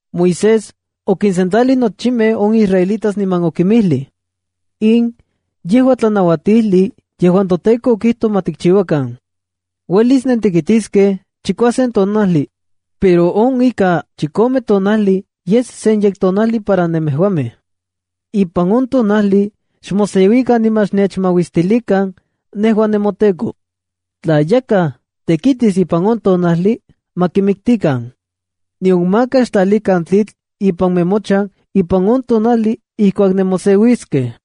Moisés okinsentlalij nochimej on israelitas niman okinmijlij: “In yejua tlanauatijli yejuan toTEKO okijtoj ma tikchiuakan: Uelis nentekitiskej chikuasen tonajli, pero on ika chikome tonajli yes sen yektonajli para nejuamej. Ipan on tonajli xmoseuikan niman xnechmauistilikan nejua nemoTEKO. Tla yakaj tekitis ipan on tonajli, ma kimiktikan. Nion maka xtlalikan tlitl ipan nemochan ipan on tonajli de neseuijli.”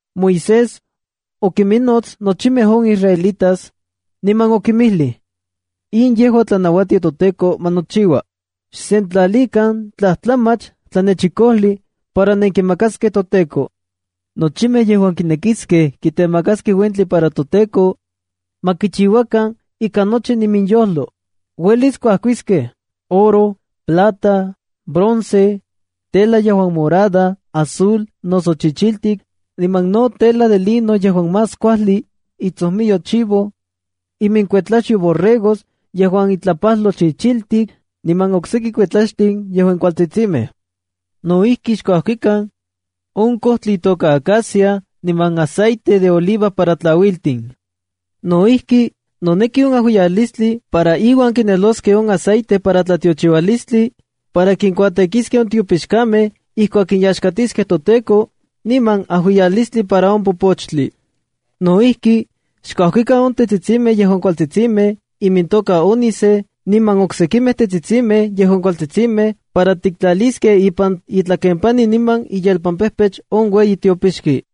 Moisés okiminnots nochimej on israelitas, niman okinmijlij: “In yejua tlanauatia toTEKO ma nochiua: Xsentlalikan tlajtlamach tlanechikojli para nenkimakaskej toTEKO. Nochimej yejuan kinekiskej kitemakaskej uentli para toTEKO, ma kichiuakan ika nochi iminyojlo. Uelis kuajkiskej: oro, plata, bronce, tela yejuan morada, azul, noso chichiltik, niman no tela de lino yejuan más kuajli, itsojmiyo chivo, iminkuetlaxyo borregos yejuan tlapajloj chichiltik, niman okseki kuetlaxtin yejuan kualtsitsimej. No ijki, xkuajkikan: on kojtli itoka acacia, niman aceite de oliva para tlauiltin. No ijki, noneki on ajuiyalistli para iuan kineloskej on aceite para tlatiochiualistli, para kinkuatêkiskej on tiopixkamej ijkuak kinyaxkatiskej toTEKO, niman ajuiyalistli para on popochtli. No ijki, xkuajkikan on tetsitsimej yejuan kualtsitsimej imintoka ónice niman oksekimej tetsitsimej yejuan kualtsitsimej para tiktlaliskej ipan itlakempani niman iyelpampejpech on ueyi tiopixki.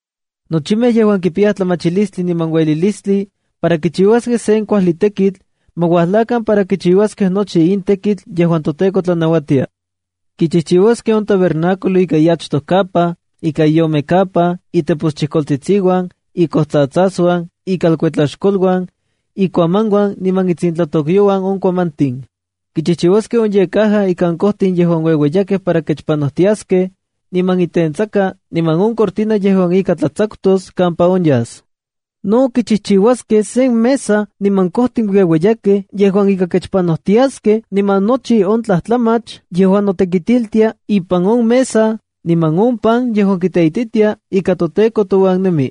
’Nochimej yejuan kipiyaj tlamachilistli niman uelilistli para kichiuaskej sen kuajli tekitl, ma uajlakan para kichiuaskej nochi in tekitl yejuan toTEKO tlanauatia. Kichijchiuaskej on tabernáculo ika iachtoj capa, ika iome capa, iteposchijkoltsitsiuan, ikojtsatsasuan, ikalkuetlaxkoluan, ikuamanuan niman itsintlatokyouan on kuamantin. Kichijchiuaskej on yekcaja ikan kojtin yejuan ueueyakej para kechpanojtiaskej, niman itentsaka, niman on cortina yejuan ika tlasakutos kampa onyas. No kichijchiuaskej sen mesa niman kojtin ueueyakej yejua ika kechpanojtiaskej niman nochi on tlajtlamach yejuan notekitiltia ipan on mesa, niman on pan yejuan kiteititia ika toTEKO touan nemi.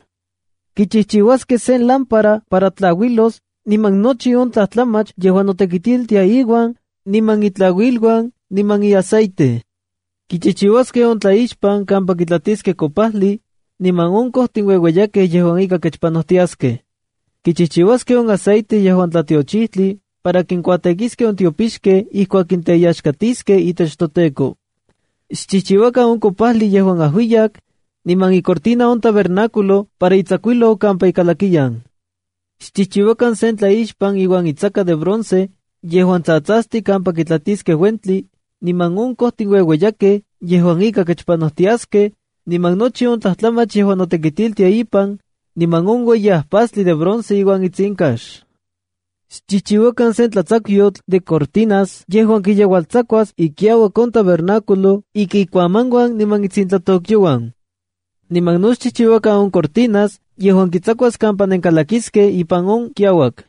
Kichijchiuaskej sen lámpara para tlauilos, niman nochi on tlajtlamach yejuan notekitiltia iuan, niman itlauiluan, niman iaceite. Kichijchiuaskej on tlaixpan kampa kitlatiskej kopajli, niman on kojtin ueueyakej yejuan ika kechpanojtiaskej. Kichijchiuaskej on aceite yejuan tlatiochijtli para kinkuatêkiskej on tiopixkej ijkuak kinteyaxkatiskej itech toTEKO. Xchijchiuakan on kopajli yejuan ajuiyak, niman icortina on tabernáculo para itsakuijlou kampa ikalakiyan. Xchijchiuakan sen tlaixpan iuan itsaka de bronce yejuan tsatsastik kampa kitlatiskej uentli, niman on kojtin ueueyakej yejua ika kechpanojtiaskej, niman nochi on tlajtlamach yejuan notekitiltia ipan, niman on ueyi ajpastli de bronce iuan itsinkax. Xchijchiuakan sen tlatsakuyotl de cortinas yejuan kiyeualtsakuas ikiauak on tabernáculo ika ikuamanuan niman intsintlatokyouan. Niman no xchijchiuakan on cortinas yejuan kitsakuas kampa nenkalakiskej ipan on kiauak.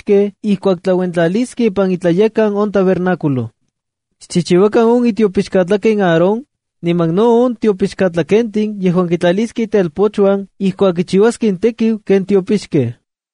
Xchijchiuakan on tlakentin yejuan kitlaliskej on tiopixkej ijkuak tlauentlaliskej ipan iTlayekkan on tabernáculo. Xchijchiuakan on itiopixkatlaken Aarón, niman no on tiopixkatlakentin yejuan kitlaliskej itelpochuan ijkuak kichiuaskej intekiu ken tiopixkej.”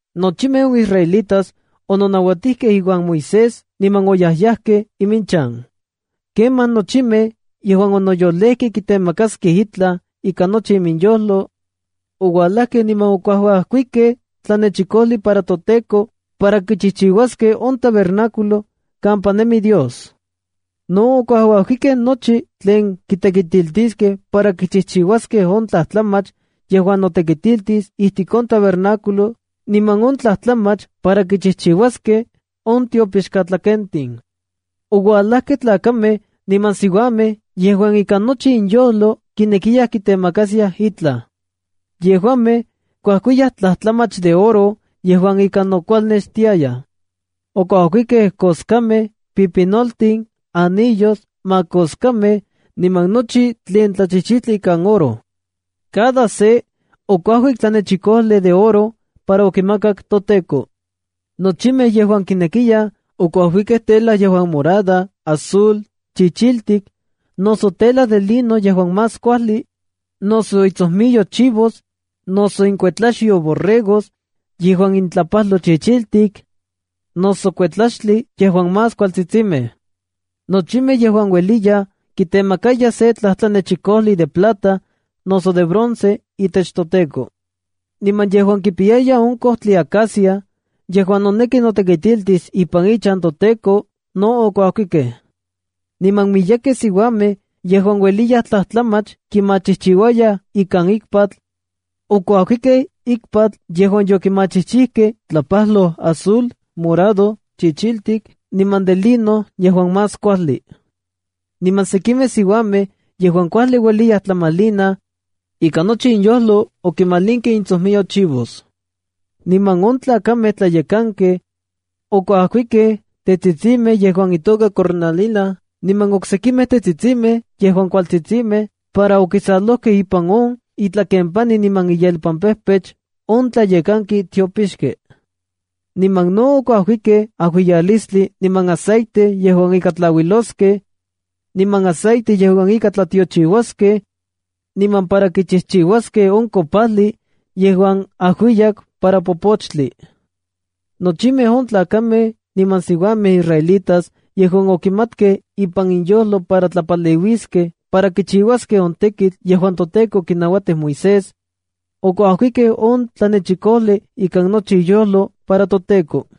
Nochimej on israelitas ononauatijkej iuan Moisés niman oyajyajkej iminchan. Kemaj nochimej yejuan onoyolejkej kitemakaskej itlaj ika nochi iminyojlo, ouajlajkej niman okuajuajkikej tlanechikojli para toTEKO para kichijchiuaskej on tabernáculo kampa nemi Dios. No okuajuajkikej nochi tlen kitekitiltiskej para kichijchiuaskej on tlajtlamach yejuan notekitiltis ijtik on tabernáculo niman on tlajtlamach para kichijchiuaskej on tiopixkatlakentin. Oualajkej tlakamej niman siuamej yejuan ika nochi inyolo kinekiyaj kitemakaskej itlaj. Yejuamej kuajkiyaj tlajtlamach de oro yejuan ika nokualnextiayaj. Okuajkikej koskamej, pipiloltin, anillos, makoskamej niman nochi tlen tlachijchijtli ika oro. Cada se okuajkik tlanechikojli de oro para okimakak toTEKO. Nochimej yejuan kinekiyaj okuajkikej tela yejuan morada, azul, chichiltik, noso tela de lino yejuan más kuajli, noso itsojmiyo chivos, noso inkuetlaxyo borregos yejuan tlapajloj chichiltik, noso kuetlaxtli yejuan más kualtsitsimej. Nochimej yejuan ueliyaj kitemakayaj se tlanechikojli de plata, noso bronce itech toTEKO. Niman yejuan kipiyayaj on kojtli acacia yejuan noneki notekitiltis ipan ichan toTEKO, no okuajkikej. Niman miyekej siuamej yejuan ueliyaj tlajtlamach kimachijchiuaj ikan ikpatl, okuajkikej ikpatl yejuan yokimachijchijkej tlapajloj azul, morado, chichiltik niman de lino yejuan más kuajli. Niman sekimej siuamej yejuan kuajli ueliyaj tlamalinaj, ika nochi inyojlo okimalinkej intsojmiyo chivos. Niman on tlakamej tlayekankej okuajkikej tetsitsimej yejuan itoka cornalina niman oksekimej tetsitsimej yejuan kualtsitsimej para okisalojkej ipan on itlakempani niman iyelpampejpech on tlayekanki tiopixki. Niman no okuajkikej ajuiyalistli niman aceite yejuan ika tlauiloskej, niman aceite yejuan ika tlatiochiuaskej, niman kopajli yejuan ajuiyak para popochtli. Nochimej on tlakamej niman siuamej israelitas yejuan okimatkej ipan inyojlo para tlapaleuiskej para kichiuaskej on tekitl yejuan toTEKO okinauatij Moisés, okuajkikej on tlanechikojli ika nochi inyojlo para toTEKO.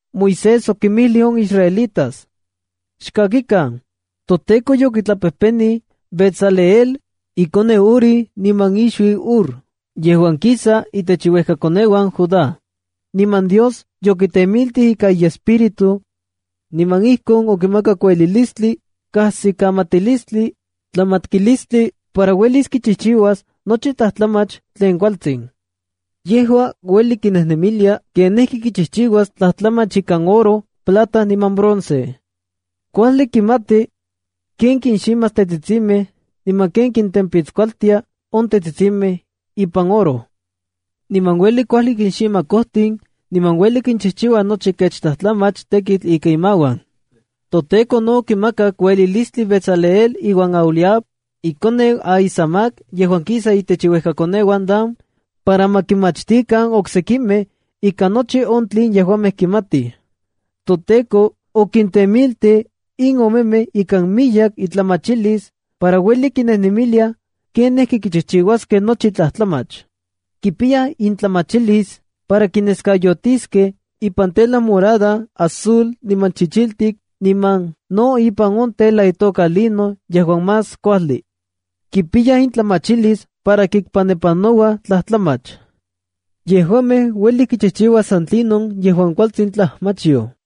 Moisés okinmijlij on israelitas: “Xkakikan, toTEKO yokitlapejpenij Bezaleel, ikoneu Uri niman ixuiu Hur yejuan kisa itech iuejkakoneuan Judá. Niman Dios yokitemiltij ika iEspíritu, niman ijkon okimakak uelilistli, kajsikamatistli, tlamatkilistli para uelis kichijchiuas nochi tlajtlamach tlen kualtsin. Yejua ueli kinejnemilia kenijki kichijchiuas tlajtlamach ikan oro, plata niman bronce. Kuajli kimati ken kinximas tetsitsimej niman ken kintepitskualtia on tetsitsimej ipan oro. Niman ueli kuajli kinxima kojtin, niman ueli kichijchiua nochi kech tlajtlamach tekitl ika imauan. ToTEKO no okinmakak uelilistli Bezaleel iuan Aholiab, ikoneu Ahisamac yejuan kisa itech iuejkakoneuan Dan, para ma kinmachtikan oksekimej ika nochi on tlen yejuamej kimatij. ToTEKO okintemiltij in omemej ikan miyek intlamachilis para ueli kinejnemiliaj kenijki kichijchiuaskej nochi tlajtlamach. Kipiyaj intlamachilis para kixneskayotiskej ipan tela morada, azul niman chichiltik niman no ipan on tela itoka lino yejuan más kuajli. Kipiyaj intlamachilis para kikpanepanouaj tlajtlamach. Yejuamej uelij kichijchiuaj san tlinon yejuan kualtsin tlajmachyoj.